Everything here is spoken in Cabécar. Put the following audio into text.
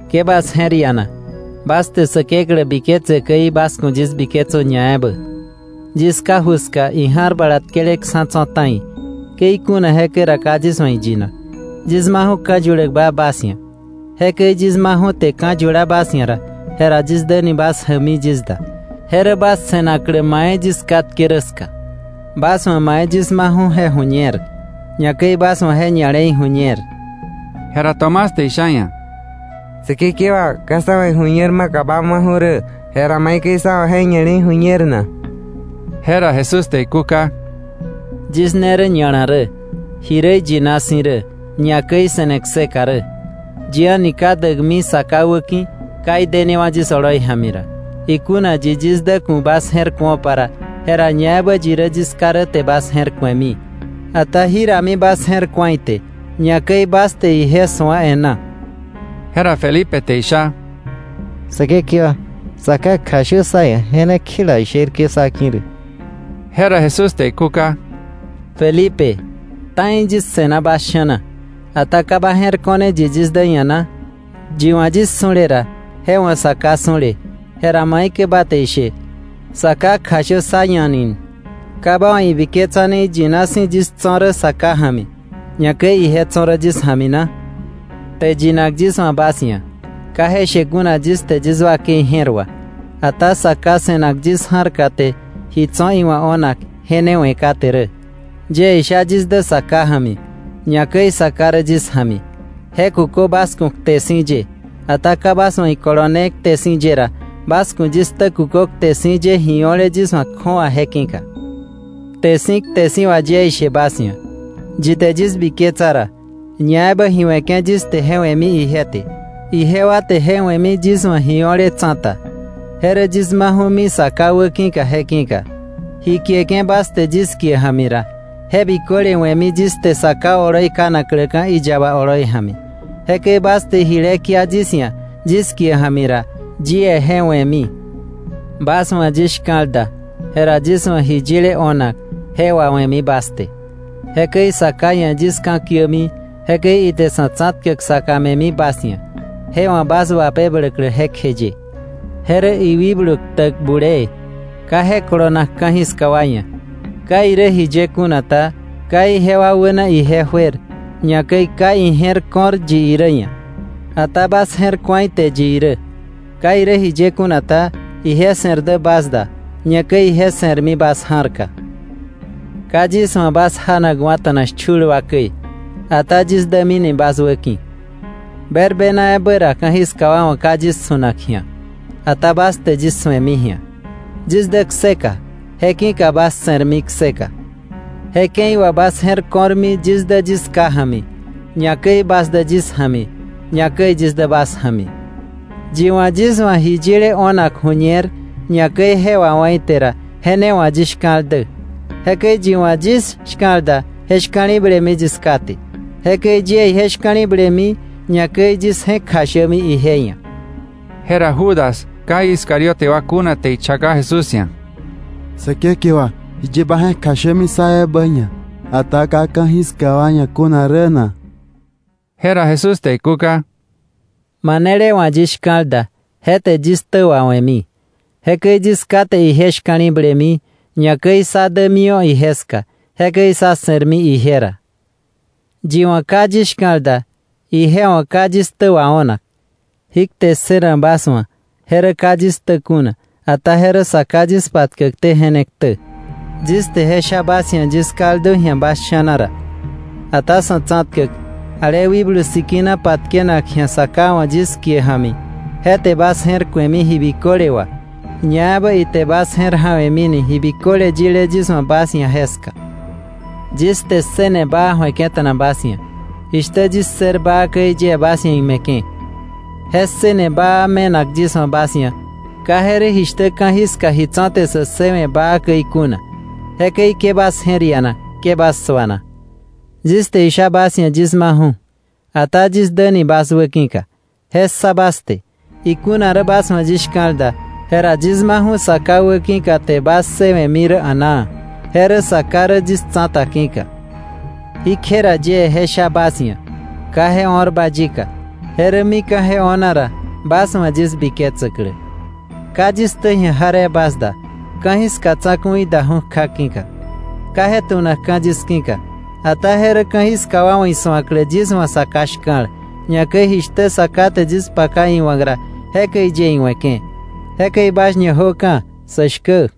Ke bas je̱r iana. Bas te Säkeklä biketse käi, bas ku̱ yis biketsö ñaebä. Yis Ká ju ska ija̱r bala tkeleksa̱ tso̱ ta̱i. Ke ikuna jekäi ra, ka yis wa̱ iyinak. Yis maju̱ ka̱ yuläkba bas ia̱. Jekäi yis maju̱ te ka̱ yula bas ia̱ ra, jera yis däni bas jäkmi yis da. Je rä bas se̱naklä mai yis katke rä ska. Bas wa̱ mai yis maju̱ je ju̱ñer, ñakäi bas wa̱ je ña̱le̱i ju̱ñer. Jera Tomás te isha iia̱: —Säkekewa, ka sá wa̱ iju̱ñer maka ba maju̱ rä, jera ¿maikäi sá wa̱ je ña̱le̱i ju̱ñer na? Jera Jesús te ikúka: —Yis ne rä ña̱la rä, ji rä iyina si̱ rä, ñakäi se̱ne kseka rä. Yi a̱ni ka däkmi Sa Ká wäki̱, ka idenewa̱ yis oloi ja̱mi ra. Ikuna yi yis dä ku̱ bas je̱r ku̱opa ra, jera ñaebä yi rä yis Ká rä te bas je̱r ku̱emi; ata jirami bas je̱r ku̱a ite, ñakäi bas te ije su̱a e̱ná. Jera Felipe te isha: —Säkekewa, Sa Ká kjashö sá ia̱, je ne kjela sherke̱ sá ki̱ rä. Jera Jesús te ikúka: —Felipe, ta̱i yis se̱na bas sha̱na, ¿ata ka ba je̱r ko̱r yi yis dä ia̱ na? Yi wa̱ yis su̱le ra, je wa̱ Sa Ká su̱le; jera ¿maikäi ba te ishe: ‘Sa Ká kjashö sá ia̱ ni?’ ¿Ka ba wa̱ ibiketsane iyina si̱ yis tso̱ rä Sa Ká ja̱mi, ñakäi ije tso̱ rä yis ja̱mi na? Kte yinak yis wa̱ bas ia̱, ka je she kuna yis te yis wakei je̱r wà. Ata Sa Ká se̱nak yis ja̱rka te ji tso̱ iwa̱ o̱nak je ne we̱ kate rä. Yie isha yis dä Sa Ká ja̱mi, ñakäi Sa Ká rä yis ja̱mi, je kukö bas ku̱ kte si̱ ye. Ata ka bas wa̱ ikolone kte si̱ ye ra, bas ku̱ yis ktä kukö kte si̱ ye ji o̱le yis wa̱ kju̱awa je ki̱ka. Kte si̱ kte si̱ wà yie ishe bas ia̱, yi te yis biketsa ra, ñaebä ji we̱ke̱ yis te je we̱mi ije te. Ijewa te je we̱mi yis wa̱ ji o̱le tsa̱ta, je rä yis maju̱mi Sa Ká wäki̱ je ki̱ka. Ji kieke̱ bas te yis kie ja̱mi ra, je biköle we̱mi yis te Sa Ká oloi kanakläka̱ iyaba oloi ja̱mi. Jekäi bas te jile kia yis ia̱ yis kie ja̱mi ra, yie je we̱mi. “Bas wa̱ yis shka̱l da, jera yis wa̱ ji yile o̱nak je wawe̱mi bas te. Jekäi Sa Ká ia̱ yis ka̱kiämi, jekäi ite Sa̱ Tsa̱tkäk saka me̱mi bas ia̱, je wa̱ bas wapebläklä jekjeye. Je rä iwikblu ktäk bulee. Ka je kolonak ka̱jiska wa ia̱. Ka irä jiye kuna ta, ka ijewa wäna ije juer, ñakäi ka ije̱r ko̱r yi irä ia̱. Ata bas je̱r ku̱a ite yi irä. Ka irä jiye kuna ta, ije se̱r dä bas da, ñakäi ije se̱rmi bas ja̱rka. “Ka yis wa̱ bas janakwa̱ta̱na shchul wa käi. Ata yis dämini bas wäki̱. Berbena ebä ra ka̱jiska wa wa̱ ka yis su̱nak ji̱a, ata bas te yis su̱emi ji̱a. Yis dä kseka. Je ki̱ka bas se̱rmi kseka. Je ke̱i wà bas je̱r ko̱rmi yis dä yis Ká ja̱mi, ñakäi bas dä yis ja̱mi, ñakäi yis dä bas ja̱mi. Yi wa̱ yis wa̱ ji yile o̱nak ju̱ñer, ñakäi je wawá̱ ite ra, je ne wa̱ yis shka̱l dä. Jekäi yi wa̱ yis shka̱l da, je shka̱li̱blemi yis Ká te. Jekäi yie ije shka̱li̱blemi, ñakäi yis je̱k kjashämi ije ia̱.” Jera Judas, ka Iscariote wa kuna te ichaka Jesús ia̱: —Säkekewa, ¿jiye ba je̱k kjashämi sá ebä ia̱, ata ka ka̱jiska wa ia̱ kuna rä na? Jera Jesús te ikúka: —Manele wa̱ yis shka̱l da, je te yis ktä wawe̱mi. Jekäi yis Ká te ije shka̱li̱blemi. Ñakäi sá dämiwa̱ ije ska, jekäi sá se̱rmi ije ra. Yi wa̱ ka yis shka̱l da, ije wa̱ ka yis ktä wao̱nak. Jí kte ssënak bas wa̱ je rä ka yis ktä kuna, ata je rä Sa Ká yis patkäkté je ne ktä. “Yis te je sha bas ia̱ yis kaldu ji̱a bas sha̱na ra. Ata Sa̱tsa̱tkäk, ale Wikblu Sikina patkenak ji̱a Sa Ká wa̱ yis kie ja̱mi, je te bas je̱r ku̱emi ji biköle wà, ñaebä ite bas je̱r ja̱we̱mini ji biköle yile yis wa̱ bas ia̱ jeska.” “Yis te ssëne baa ju̱eke̱ta̱na bas ia̱. Jishtä yis ssër baa käi yie bas ia̱ ime̱ke̱. Je ssëne baa me̱nak yis wa̱ bas ia̱, ka je rä jishtä ka̱jiska ji tso̱ te sä ssëwe̱ baa käi kuna. Jekäi ke bas je̱r iana, ke bas suana. Yis te isha bas ia̱ yis maju̱, ata yis däni bas wäki̱ka, je ssa bas te. Ikuna rä bas wa̱ yis shka̱l da, jera yis maju̱ Sa Ká wäki̱ka te bas ssëwe̱mi rä a̱naa, je rä Sa Ká rä yis tsa̱ta ki̱ka. Jí kje ra yie je sha bas ia̱, ka je o̱rba yika; je rä mika̱ je o̱na ra, bas wa̱ yis biketsäklä.” “Ka yis ktä ji̱a jaree bas da, ka̱jiska tsa̱ku̱i daju̱ kja ki̱ka. Ka je tu̱nakka̱ yis ki̱ka. Ata je rä ka̱jiska wa wa̱ isu̱aklä yis wa̱ Sa Ká shka̱l, ñakäi jishtä Sa Ká te yis paka iwa̱k ra, jekäi yie iwe̱ke̱. “Jekäi bas ñajöka̱, sä shkä.”